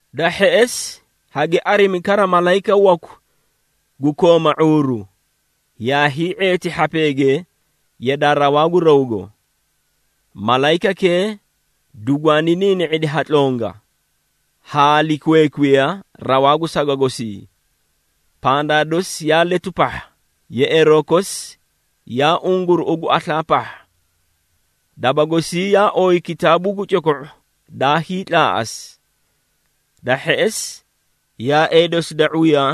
Da hheꞌesi, hagi arimi kara malayika waku gu kooma ⁄uuru, yaa hii⁄eeti hhapeege yadaa rawaa gu rawgo. Malayikakee dugwaani niini⁄idi ha tlonga, haa likweekwiya rawaa gu saga gosii. Pandaa dosi yaa letu pahha, yeꞌeeroo kosi yaa unguruꞌu gu aslaa pahha. Daba gosii yaa ooyi kitaabuu gu coko⁄o daa hiitlaaꞌasi. Da hheꞌesi, yaaee dosi da ⁄uya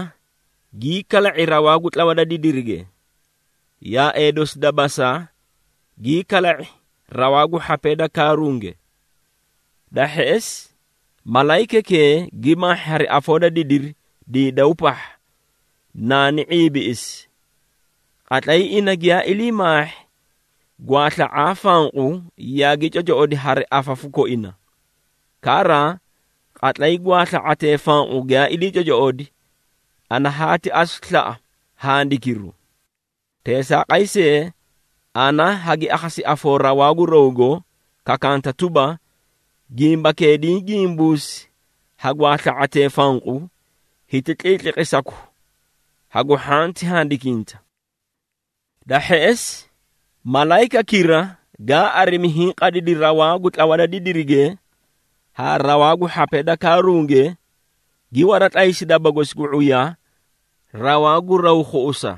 gii kala⁄adi rawaa gu tlawa da didirige, yaaee dosi da basa gii kala⁄adi rawaa gu hhapee da kaarunge. Da hheꞌesi, malayikakee gi maahhi hari afoo da didiri diidaw pahha naani ⁄iibiꞌisi. Qatlay ina giyaa ilii maahhi, gwaasla⁄aa fanqu yaagi cocoꞌodi hari afafu koina. Kara, qatlay gwaasla⁄atee fanqu giyaa ilii cocoꞌodi, ana haati asu slaꞌa handikiru. Teesaaqay see, ana hagi akhasi afoo rawaa gu rawgo kakanta tuba, “Gimbakee diĩ gimbuusi ha gwaasla⁄atee fanqu, hiti tliitliqisaku hagu hhanti handikinta.” Da hheꞌesi, malayikakira gaa arimi, hiĩ qadidi rawaa gu tlawa da didirige haa rawaa gu hhapee da kaarunge, gi waratlaysi daba gosi gu ⁄uya rawaa gu raw khuꞌusa.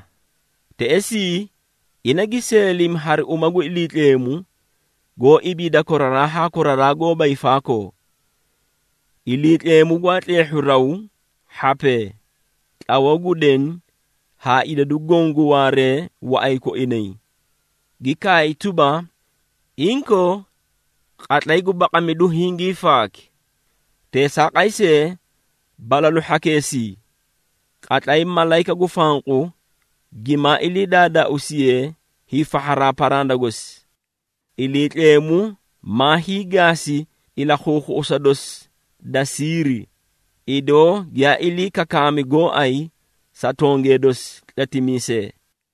Teꞌesii, ina gi seelimi hari uma gu Iliitleemu, goó ibiida koraraa haa koraraa goóba hiifaakoo. Iliitleemu gwaa tleehhu raw, hhapee, tlawoo gu deni haa idadu goõ gu waaree waꞌay koinay, gi kaay tuba, “Inkoo, qatlay gu baqamidu hingii faaki! Teesaaqay see, balalu hhakeesii, qatlay malayika gu fanqu gimaa ilii daadaauusiye hiifahharaa paranda gosi, Iliitleemu maa hiigaasi ilakhuukhuꞌusa dosi da siiri, idoo giyaa ilii kakaami gooay sa tongee dosi tletimiisee.”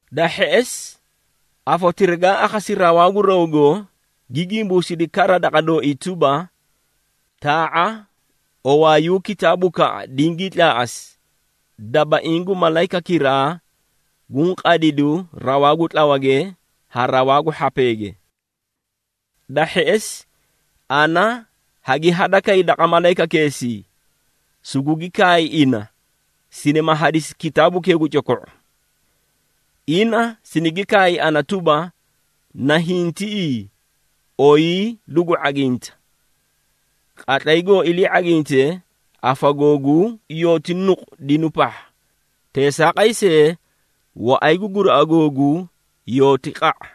Da hheꞌesi, afotira gaa akhasi rawaa gu rawgo, gi gimbuusidi kara daqa dooii tuba, “Taa⁄a owaayuu kitaabukaꞌa dingii tlaaꞌasi, dabaiĩ gu malayikakiraa guũ qadidu rawaa gu tlawage haa rawaa gu hhapeege.” Da hheꞌesi, ana hagi hadakay daqa malayikakeesii, sugugi kaay ina sinima hadisi kitaabukee gu coko⁄u. Ina sinigi kaay ana tuba, “Nahiĩ tiꞌii oyii lugu ⁄aginta. Qatlay goo ilii ⁄aginte, afa googuu yooti nuqu dinu pahha, teesaaqay see, waꞌay gu guraꞌa googuu yooti qa⁄a.”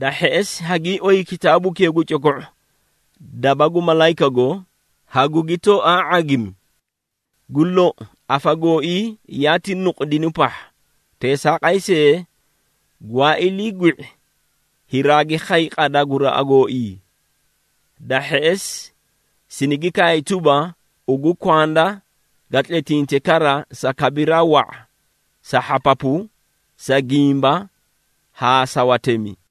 Da hheꞌesi, hagii oyi kitaabukee gu coko⁄u daba gu malayikago, hagugi tooaa ⁄agimi. Gu lou, afa gooii yaati nuqu dinu pahha, teesaaqay see, gwaa ilii gwi⁄i, hiraagi khay qada guraꞌa gooii. Da hheꞌesi, sinigi kaay tuba, “Ugu kwanda ga tletinte kara sa kabiraa wa⁄a, sa hhapapu, sa gimba haa sa watemi.”